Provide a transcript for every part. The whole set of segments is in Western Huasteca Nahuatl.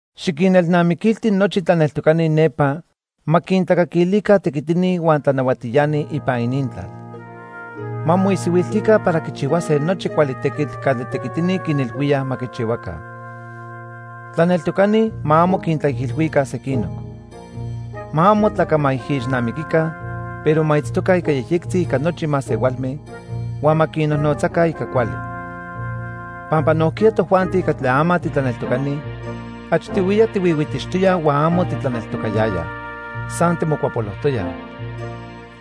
Xiquinelnamiquilti nochi tlaneltocani nepa ma quintlacaquilica tequitini huan tlanahuatiani ipan inintlal. Ma moisihuiltica para quichihuase nochi cuali tequitl catli tequitini quinilhuíaj ma quichihuaca. Tlaneltocani ma amo quintlaijilhuica sequinoc. Ma amo tlacamaijixnamiquica, pero ma itztoca ica yejyectzi ica nochi masehualme huan ma quinnojnotzaca ica cuali. Pampa nojquiya tojuanti catli ama titlaneltocani, achtihuiya tihuihuitixtoyaj huan amo titlaneltocayayaj. San timocuapolojtoyaj.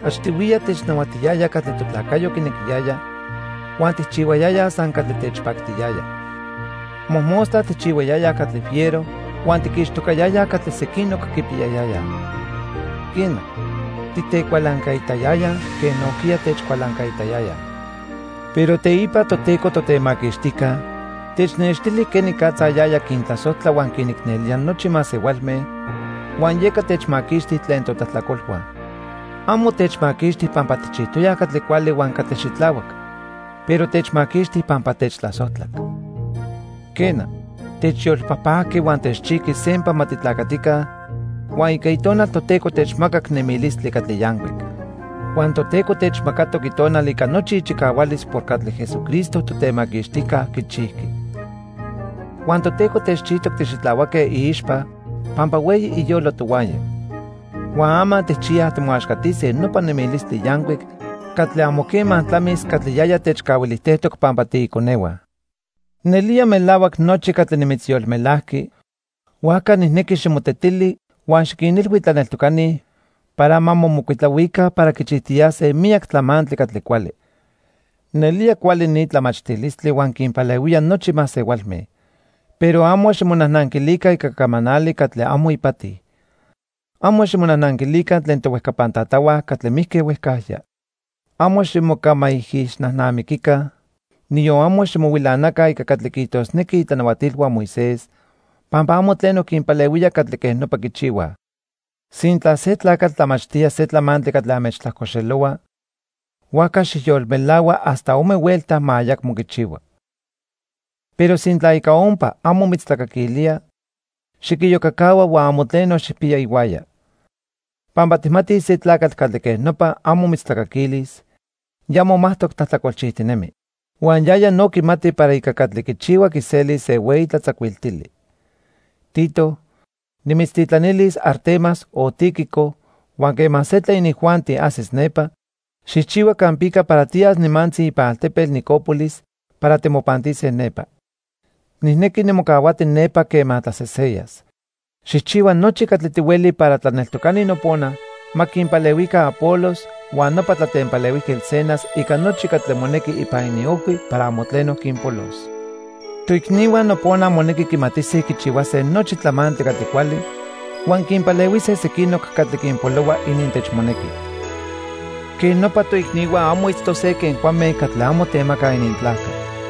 Achtihuiya technahuatiyaya catli totlacayo quinequiyaya, huan tijchihuayayaj san catli techpactiyaya. Mojmostla tijchihuayayaj catli fiero huan tiquixtocayayaj catli sequinoc quipiyayayaj. Quena, titecualancaitayayaj quen nojquiya techcualancaitayayaj. Pero teipa Toteco Totemaquixtijca technextili quenicatza yaya quintlasojtla huan quinicnelía nochi masehualme, huan yeca techmaquixti tlen totlajtlacolhua. Amo techmaquixti pampa tijchijtoyaj catli cuali huan catli xitlahuac, pero techmaquixti pampa techtlasojtlac. Quena, techyolpajpajqui huan techchijqui sempa ma titlacatica, huan ica Itonal Toteco techmacac nemilistli catli yancuic. Huan Toteco techmacatoc Itonal ica nochi ichicahualis por catli Jesucristo, Totemaquixtijca, quichijqui. Huan Toteco techchijtoc tixitlahuaque iixpa pampa hueyi iyolo tohuaya. Huan ama tijchiyaj timoaxcatise nopa nemilistli yancuic catli amo quema tlamis catli yaya techcahuilijtejtoc pampa tiiconehua. Nelía melahuac nochi catli nimitzyolmelajqui, huajca nijnequi ximotetili huan xiquinilhui tlaneltocani para ma momocuitlahuica para quichijtiyase miyac tlamantli catli cuali. Nelía cuali ni tlamachtilistli huan quinpalehuía nochi masehualme. Pero amo ximonajnanquilica ica camanali catli amo ipati. Amo ximonajnanquilica tlen tohuejcapan tatahua catli mijque huejcajya. Amo ximocamaijixnajnamiquica, niyon amo ximohuilanaca ica catli quiijtosnequij itlanahuatilhua Moisés, pampa amo tleno quinpalehuía catli quej nopa quichihuaj. Sintla se tlacatl tlamachtía se tlamantli catli anmechtlajcoxelohua, huajca xijyolmelahua hasta ome huelta ma ayacmo quichihua. Pero sintla ica ompa amo mitztlacaquilía, xiquiyocacahua huan amo tleno xijpiya ihuaya. Pampa tijmatij se tlacatl catli quej nopa amo mitztlacaquilis, ya momajtoc tlajtlacolchijtinemi. Huan yaya no quimati para ica catli quichihua quiselis se hueyi tlatzacuiltili. Tito, nimitztitlanilis Artemas o Tíquico huan quema se tlen inijuanti ajsis nepa, xijchihua campica para tiyas nimantzi ipan altepetl Nicópolis para timopantise nepa. Nijnequi nimocahuati nepa quema tlaseseyas. Xijchihua nochi catli tihueli para tlaneltocani nopona ma quinpalehuica Apolos huan nopa tlatempalehuijquetl Zenas ica nochi catli monequi ipan iniojhui para amo tleno quinpolos. Toicnihua nopona monequi quimatise quichihuase nochi tlamantli catli cuali, huan quinpalehuise sequinoc catli quinpolohua inintechmonequi. Quej nopa, toicnihua amo itztose quen cuame catli amo temacaj inintlajca.